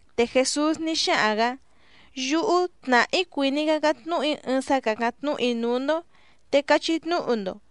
Te Jèsús ní xáhaⁿ‑gǎ: —Yúhú tnàhá‑í cuìní‑í cácáⁿ tnúhu‑í ɨɨⁿ sá càcáⁿ tnúhu‑í núú‑ndó, te cachí tnúhu‑ndo.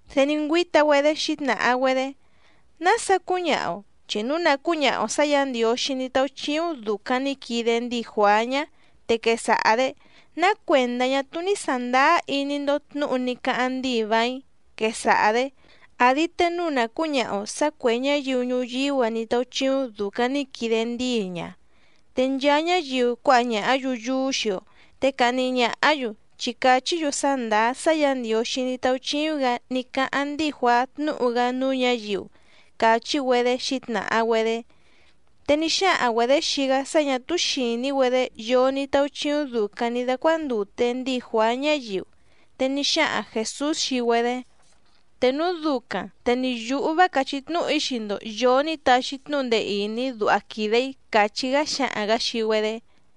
Te ní ngüíta‑güedé xǐtnàha‑güedé: —¿Nása cúñaha‑o? Chi núu nà cúñaha‑o sǎ Yǎ Ndiǒxí ní táúchíúⁿ dùcaⁿ ní quide ndíi Juàá ñá, te quesaha‑dě: “¿Ná cuèndá ñá túú ní sàndáá iní‑ndó tnǔhu ní cáháⁿ ndíi vàíⁿ?”, quesaha‑dě. Àdi te núu nà cúñaha‑o sǎ cuè ñáyiu ñuyíú‑a ní táúchíúⁿ dùcaⁿ ní quide ndíi ña, te nchaa ñáyiu cuáha ñàhá‑yu yúú xii‑o, te cahni ñàhá‑yu, chi càchí‑yu sá ndàá sá Yǎ Ndiǒxí ní táúchíúⁿ‑gǎ ní cáháⁿ ndíi Juàá tnúhu‑gá núú ñǎyiu —càchí‑güedé xǐtnàha‑güedé. Te ní xáhaⁿ‑güedě xii‑gá sá ñà túú xìní‑güedé yoo ní táúchíúⁿ dùcaⁿ ní dácuándùte ndíi Juàá ñáyiu. Te ní xáhaⁿ Jèsús xii‑güedé: —Te núu ducaⁿ te ni yǔhú vá càchí tnúhu‑í xii‑ndo yòo ní taxi tnúhu ndee ìní duha quìde‑í —càchí‑gá xáhaⁿ‑gǎ xii‑güedé.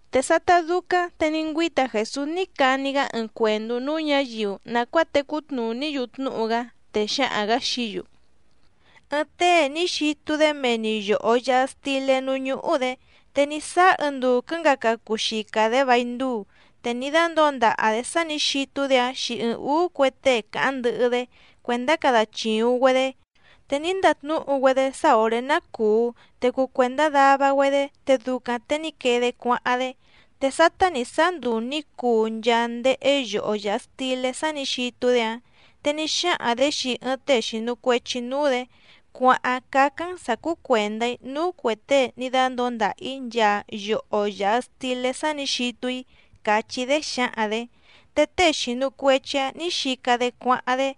Te sátá dúcáⁿ te ní ngüíta Jèsús ní cani‑gá ɨɨⁿ cuèndú núú ñǎyiu nàcuáa tecú tnùní‑yu tnúhu‑gá, te xáhaⁿ‑gǎ xií‑yu: —Ɨɨⁿ tée ní xitu‑dé mee‑ni yòho yaha stilé núú ñúhú‑dě. Te ní sáá ɨɨⁿ nduu quɨ̌ngaca cuu xica‑dě vài nduu te ní dándǒo ndaha‑dě sá nǐ xitu‑dé‑áⁿ xii ɨɨⁿ ǔú cue tée càháⁿ ndɨhɨ‑dé cuèndá cada chìuⁿ‑güedé, te ní ndatnúhu‑güedé sá òré ná cùu te cuu cuèndá dava‑güedé te ducaⁿ te ní quee‑dé cuáháⁿ‑dé. Te sátá nǐ sáá nduu nǐ cuu nchaa ndéhé yoho yàha stilé sá nǐ xitu‑dé‑áⁿ, te ní xáhaⁿ‑dě xii ɨɨⁿ tée xìnu cuechi núú‑dě: “Cuàháⁿ cácáⁿ‑n sǎ cúú cuèndá‑í núú cuè tée ní dándǒo ndàha‑í nchaa yoho yàha stilé sá nǐ xitu‑í”, càchí‑dé xǎhaⁿ‑dě. Te tée xìnu cuechi‑áⁿ nǐ xica‑dé cuáháⁿ‑dé,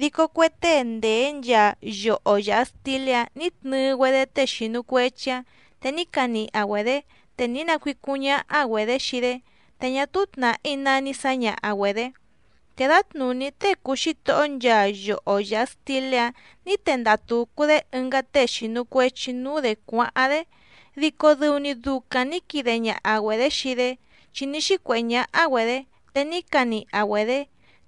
dico cue tée ndèé nchaa yoho yàha stilé‑áⁿ nǐ tnɨɨ‑güedé tée xìnu cuechi‑áⁿ te ní caniha‑güedě, te ní nacuícúⁿ ñáhá‑güedě xii‑dé, te ñá túú tnàhí ná ní sǎñaha‑güedě. Te dǎtnùní tée cùu xítohó nchaa yoho yàha stilé‑áⁿ nǐ tendaha tùcu‑dé ɨngá tée xìnu cuechi núú‑dě cuáháⁿ‑dé, dico dɨu‑ni ducaⁿ nǐ quide ñaha‑güedě xii‑dé, chi ní xícuèhé ñáhá‑güedě, te ní caniha‑güedě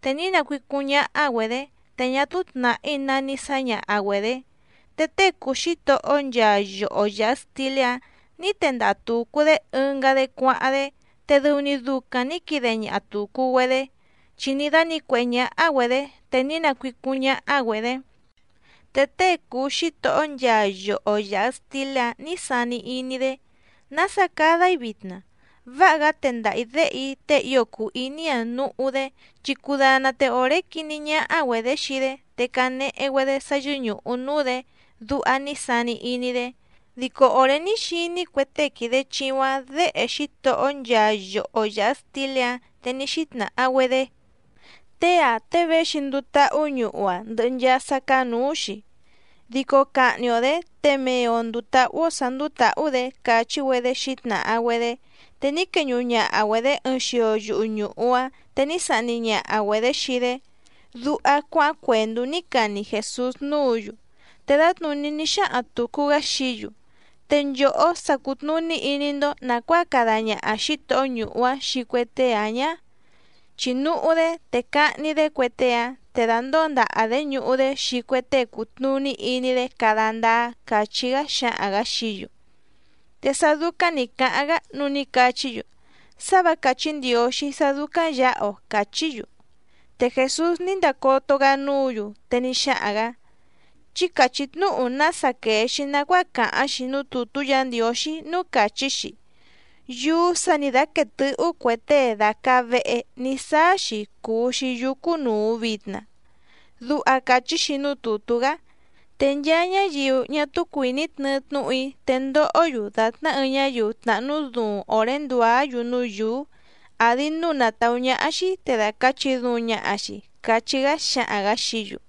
te ní nacuícúⁿ ñáhá‑güedě, te ñá túú tnàhí ná ní sǎñaha‑güedě. Te tée cùu xítohó nchaa yoho yàha stilé‑áⁿ nǐ tendaha tùcu‑dé ɨngá‑dé cuáháⁿ‑dé, te dɨu‑ni ducaⁿ nǐ quide ñaha tùcu‑güedé, chi ní dánǐcuèhé ñáhá‑güedě, te ní nacuícúⁿ ñáhá‑güedě. ’Te tée cùu xítohó nchaa yoho yàha stilé‑áⁿ nǐ sani iní‑dé: “¿Nása cada‑í vitna? Váha‑gá tendaha‑ǐ déhe‑í tée ío cùu iní‑a núhú‑dé, chi cudana te òré quiní ñáhá‑güedě xii‑dé, te canehe‑güedé sá yɨ́ñùhu núú‑dě”, duha ní sani iní‑dé. Dico òré ní xiní cue tée quìde chiuⁿ‑áⁿ děhe xítohó nchaa yoho yàha stilé‑áⁿ, te ní xítnàha‑güedé: “Tée‑ǎⁿ tée véxi nduu táhú ñuhu‑a ndɨhɨ nchaa sá cáá nǔú‑xi, dico cahni‑o‑dě te mee‑o ndùu tahú‑ó sǎ ndúú tǎhú‑dě”, càchí‑güedé xǐtnàha‑güedé. Te ní queñuhu ñaha‑güedě ɨɨⁿ xio yuhu ñùhu‑áⁿ, te ní sahni ñaha‑güedě xii‑dé —duha cuáháⁿ cuèndú ní cani Jèsús núǔ‑yu. Te dǎtnùní ní xáhaⁿ tùcu‑gá xií‑yu: —¿Te nchòhó sa cùtnuní iní‑ndó nàcuáa cada ñaha xǐtohó ñuhu‑áⁿ xii cue tée‑áⁿ ñǎ? Chi núhú‑dé te cahni‑dé cue tée‑áⁿ, te dàndóo ndaha‑dě ñuhu‑dé xii cue tée cùtnuní iní‑dé cada ndáá —càchí‑gá xáhaⁿ‑gǎ xií‑yu. Te sá dúcáⁿ nǐ cáháⁿ‑gá, núu ní cachí‑yu: —¡Sá vǎ càchí Ndiǒxí sá dúcáⁿ yǎha‑o! —càchí‑yu. Te Jèsús ní ndacoto‑gá núǔ‑yu, te ní xáhaⁿ‑gǎ: —Chí càchí tnúhu nása quèe‑xi nacuáa càháⁿ‑xi núú tùtú Yǎ Ndiǒxí, núú càchí‑xi: Yúú sǎ nǐ dáquéé tɨ̌hú cue tée dàcaa vehe ní saa‑xi cùu‑xi yúú cúnùu vitna. Duha càchí‑xi núú tùtú‑gá. Te nchaa ñáyiu ñá túú cuìní tnɨɨ tnúhu‑í, te ndohó‑yu dàtná ɨɨⁿ ñáyiu tnàhnú duuⁿ òré ndùá‑yu núú yǔú, àdi núu na tàú ñáhá‑xí te dàcachi duuⁿ ñaha‑xi —cachí‑gá xáhaⁿ‑gǎ xií‑yu.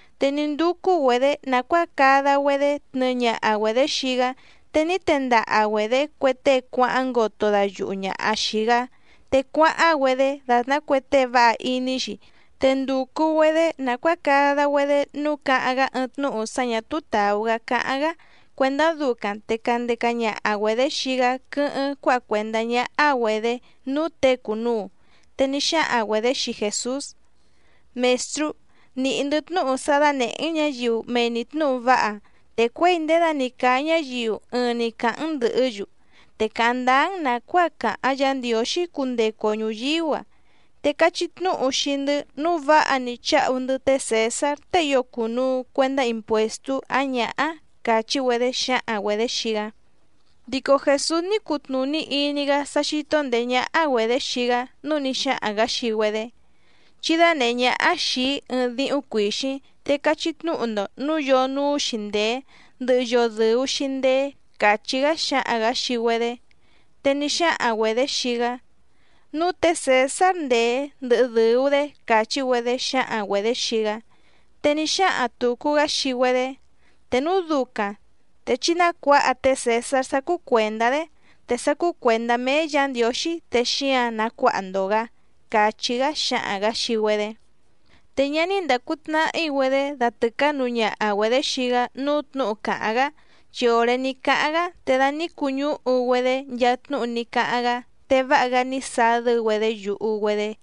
Te ní ndúcú‑güedě nàcuáa cada‑güedé tnɨɨ ñaha‑güedě xii‑gá, te ní tendaha‑güedě cue tée cuáháⁿ ngoto dayuhu ñàha xii‑gá, te cuáháⁿ‑güedé dàtná cue tée váha iní‑xi, te ndùcu‑güedé nàcuáa cada‑güedé nǔu cáháⁿ‑gá ɨɨⁿ tnúhu sá ñà túú tàú‑gá cáháⁿ‑gá cuèndá ducaⁿ te candeca ñaha‑güedě xii‑gá quɨ́hɨ́ⁿ cuáha cuèndá ñáhá‑güedě núú těe cùnuu. Te ní xáhaⁿ‑güedě xii Jèsús: —Mèstrú, nìhí‑ndɨ́ tnúhu sá dánèhé‑n ñǎyiu mee‑ni tnǔhu váha, te cuěi ndědani càa ñáyiu ɨɨⁿ‑ni càháⁿ‑n ndɨ̀hɨ́‑yu, te càháⁿ ndáá‑n nàcuáa càháⁿ Yǎ Ndiǒxí cundecu‑o ñùyíú‑a. Te cachí tnúhu xii‑ndɨ́ nǔu váha‑ni cháhu‑ndɨ́ té Cèsár tée ío cùnuu cuendá impuèstú ǎⁿ ñǎhá —càchí‑güedé xǎhaⁿ‑güedě xii‑gá. Dico Jèsús ní cutnùní iní‑gá sá xító ndèé ñáhá‑güedě xii‑gá, núu ní xáhaⁿ‑gǎ xii‑güedé: —Chí dánèhé ñáhá xìi‑í ɨɨⁿ díhúⁿ cuìxíⁿ te cachí tnúhu‑ndo nǔu yoo núú‑xi ndèé, ndɨhɨ yoo dɨ̀u‑xi ndeé —càchí‑gá xáhaⁿ‑gǎ xii‑güedé. Te ní xáhaⁿ‑güedě xii‑gá: —Núú tě Cèsár ndèé ndɨhɨ dɨ̀u‑dé —càchí‑güedé xǎhaⁿ‑güedě xii‑gá. Te ní xáhaⁿ tùcu‑gá xii‑güedé: —Te núu ducaⁿ te chí nácuǎha té Cèsár sá cúú cuèndá‑dé, te sá cúú cuèndá méé Yǎ Ndiǒxí, te xíǎⁿ nacuáha‑ndo‑gǎ —càchí‑gá xáhaⁿ‑gǎ xii‑güedé. Te ñá ní ndàcu tnahí‑güedé datɨ̀cánuu ñaha‑güedě xii‑gá núú tnǔhu càháⁿ‑gá, chi òré ní cáháⁿ‑gá, te da ní cuñúhu‑güedé nchaa tnúhu ní cáháⁿ‑gá, te váha‑gá ní sadɨ́‑güedé yuhu‑güedé.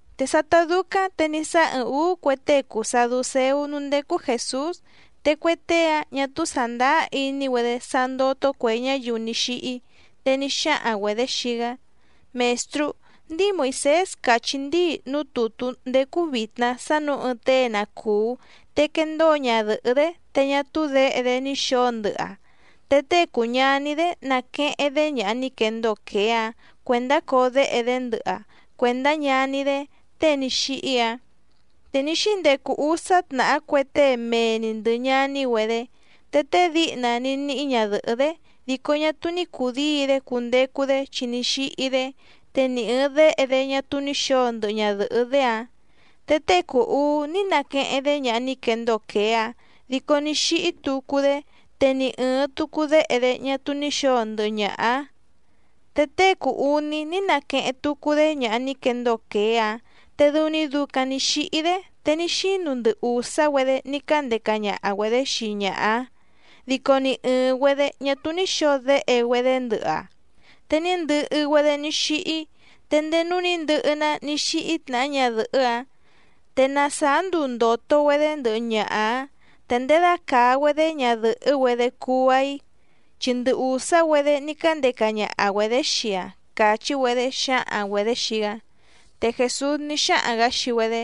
Te sátá dúcáⁿ te ní sáá ɨɨⁿ ǔú cue tée cùu saducéú núú ndécú Jèsús. Te cue tée‑áⁿ ñà túú sàndáá iní‑güedé sá ndótó cuè ñáyiu ní xíhí, te ní xáhaⁿ‑güedě xii‑gá: —Mèstrú, ndíi Moìsés càchí ndíi núú tùtú ndècu vitna sá nǔu ɨɨⁿ tée na cùú, te quendóo ñadɨ̀hɨ́‑dé te ñá túú děhe‑dé ní xǒo ndɨhɨ‑aⁿ, te tée cùu ñaní‑dé naqueheⁿ‑dé ñaha ní quendóo quèé‑áⁿ cuèndá coo déhe‑dé ndɨhɨ‑aⁿ cuèndá ñaní‑dé tée ní xíhí‑áⁿ. Te ní xíndecu úsá tnàhá cue tée mee‑ni ndɨ̀ ñaní‑güedé. Te tée díhna ní níhí ñadɨ̀hɨ́‑dé, dico ñá túú ní cùdíi‑dé cundecu‑dé chi ní xíhí‑dé, te ni ɨ̀ɨⁿ déhe‑dé ñá túú ní xǒo ndɨhɨ ñadɨ̀hɨ́‑dé‑áⁿ. Te tée cùu uú ní naqueheⁿ‑dé ñaha ní quendóo quèé‑áⁿ dico ní xíhí tucu‑dé, te ni ɨ̀ɨⁿ tucu déhe‑dé ñá túú ní xǒo ndɨhɨ ñaha‑áⁿ. Te tée cùu uní ní naqueheⁿ tucu‑dé ñaha ní quendóo quèé‑áⁿ, te dɨu‑ni ducaⁿ nǐ xíhí‑dé, te ní xínu ndɨ ùsá‑güedé ní cándeca ñaha‑güedě xii ñaha‑áⁿ, dico ni ɨ̀ɨⁿ‑güedé ñá túú ní xǒo déhe‑güedé ndɨhɨ‑aⁿ, te ní ndɨhɨ‑güedé ní xíhí. Te ndéé núú nǐ ndɨhɨ‑ná ní xíhí tnàhá ñadɨ̀hɨ́‑áⁿ. Te na sàá nduu ndòto‑güedé ndɨhɨ ñaha‑áⁿ ¿Te ndědacàa‑güedé ñadɨ̀hɨ́‑güedé cuu‑aⁿ‑i? Chi ndɨ ùsá‑güedé ní cándeca ñaha‑güedě xii‑aⁿ —càchí‑güedé xǎhaⁿ‑güedě xii‑gá. Te Jèsús ní xáhaⁿ‑gǎ xii‑güedé: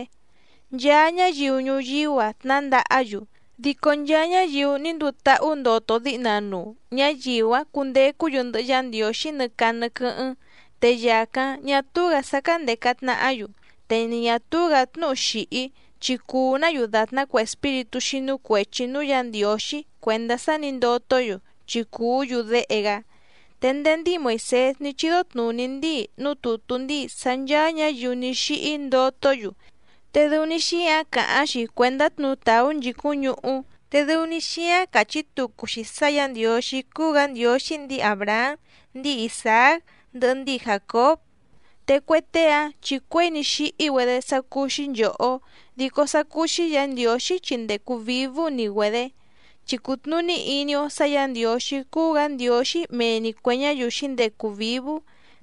—Nchaa ñáyiu ñuyíú‑a tnǎndahá‑yu. Dico nchaa ñáyiu ní nduu táhú ndoto díhna nuu ñáyiu‑áⁿ cundecú‑yu ndɨhɨ Yá Ndiǒxí nɨ caa nɨ quɨ́hɨ́ⁿ, te yàcáⁿ ñá túú‑gǎ sá cándèca tnahá‑yu. Te ni ñà túú‑gǎ tnúhu xìhí, chi cuu‑ná‑yu dàtná cue espíritú xínú cuèchi núú Yǎ Ndiǒxí cuèndá sá nǐ ndotó‑yu, chi cùú‑yu déhe‑gá. Te ndéé ndíi Moìsés ní chídó tnùní ndíi núú tùtú ndíi sá ncháá ñǎyiu ní xíhí ndotó‑yu, te dɨu‑ni xíáⁿ càháⁿ‑xi cuèndá tnutàú nchìcúⁿ ñuhú, te dɨu‑ni xíáⁿ càchí tucu‑xi sá Yǎ Ndiǒxí cúú‑gǎ Ndiǒxí ndíi Àbrahám, ndíi Isàác, ndɨhɨ ndíi Jàcób. Te cue tée‑áⁿ chi cuěi ní xíhí‑güedé sá cúú‑xí nchòhó, dico sá cúú‑xí Yǎ Ndiǒxí chi ndècu vívú‑ni‑güedě. Chi cùtnuní iní‑ó sǎ Yǎ Ndiǒxí cúú‑gǎ Ndiǒxí mee‑ni cuè ñáyiu xǐndecu vǐvú,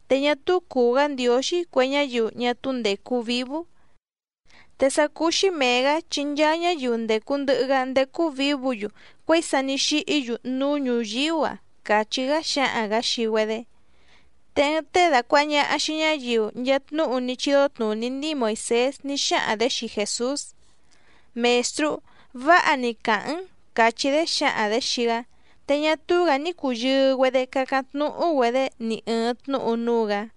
te ñá túú cùu‑gá Ndiǒxí cue ñáyiu ñá túú ndècu vívú. Te sá cúú‑xí mèe‑gá chi nchaa ñáyiu ndècu ndɨhɨ‑gá ndécú vǐvǔ‑yu cuěi sa ní xíhí‑yu núú ñùyíú‑a —càchí‑gá xáhaⁿ‑gǎ xii‑güedé. Te ɨɨⁿ tée dàcuaha ñaha xii ñáyiu nchaa tnúhu ní chídó tnùní ndíi Moìsés ní xáhaⁿ‑dě xii Jèsús: —Mèstrú, váha‑ni càháⁿ‑n —càchí‑dé xǎhaⁿ‑dě xii‑gá. Te ñá túú‑gǎ ní cùyɨɨ‑güedé cácáⁿ tnúhú‑güedě ni ɨ̀ɨⁿ tnúhu núú‑gǎ.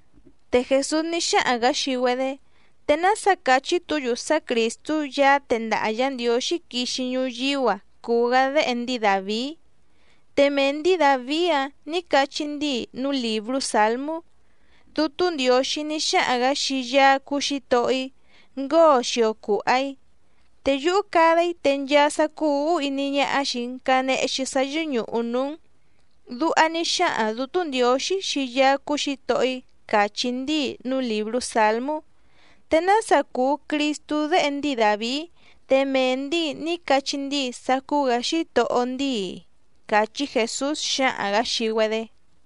Te Jèsús ní xáhaⁿ‑gǎ xii‑güedé: —¿Te nása càchí‑tu‑yu sá Crìstú Yaá tendaha Yǎ Ndiǒxí quixi ñuyíú‑a cùu‑gá déhe ndíi Dàvií? Te mee ndǐi Dàvií‑áⁿ nǐ cachí ndíi núú lìbrú Sǎlmú: Dútú Ndiǒxí ní xáhaⁿ‑gǎ xii Yaá cúú Xǐtohó‑í: “Ngóo xio cùha‑í, te yúhú cada‑í te nchaa sá cúú ǔhú iní ñáhá xìi‑n canehe‑xi sá yɨ́ñùhu núú‑n.” Duha ní xáhaⁿ Dǔtú Ndiǒxí xii Yaá cúú Xǐtohó‑í càchí ndíi núú lìbrú Sǎlmú. ¿Te nása cùu Cristú déhe ndíi Dàvií, te mee ndǐi ní cachí ndíi sá cúú‑gǎ Xítohó ndíi‑i? —càchí Jèsús xáhaⁿ‑gǎ xii‑güedé.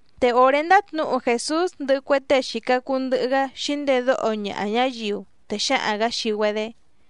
Te òré ndátnǔhu Jèsús ndɨhɨ cue tée xìca cuu ndɨhɨ‑gá xǐndedóho ñaha ñáyiu, te xáhaⁿ‑gǎ xii‑güedé: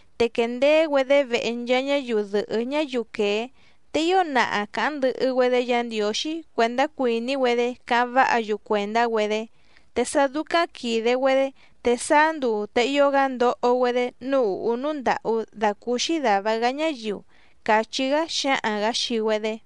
Te quèndeé‑güedé vehe nchaa ñáyiu dɨ̀hɨ́ ñáyiu quèé, te ío naha càháⁿ ndɨhɨ‑güedé Yǎ Ndiǒxí cuèndá cuìní‑güedé cáháⁿ váha‑yu cuèndá‑güedé. Te sá dúcáⁿ quìde‑güedé te sáá nduu te ío‑gá ndoho‑güedé núú ùhú núú ndàhú dàcúúxí dàva‑gá ñáyiu —càchí‑gá xáhaⁿ‑gǎ xii‑güedé.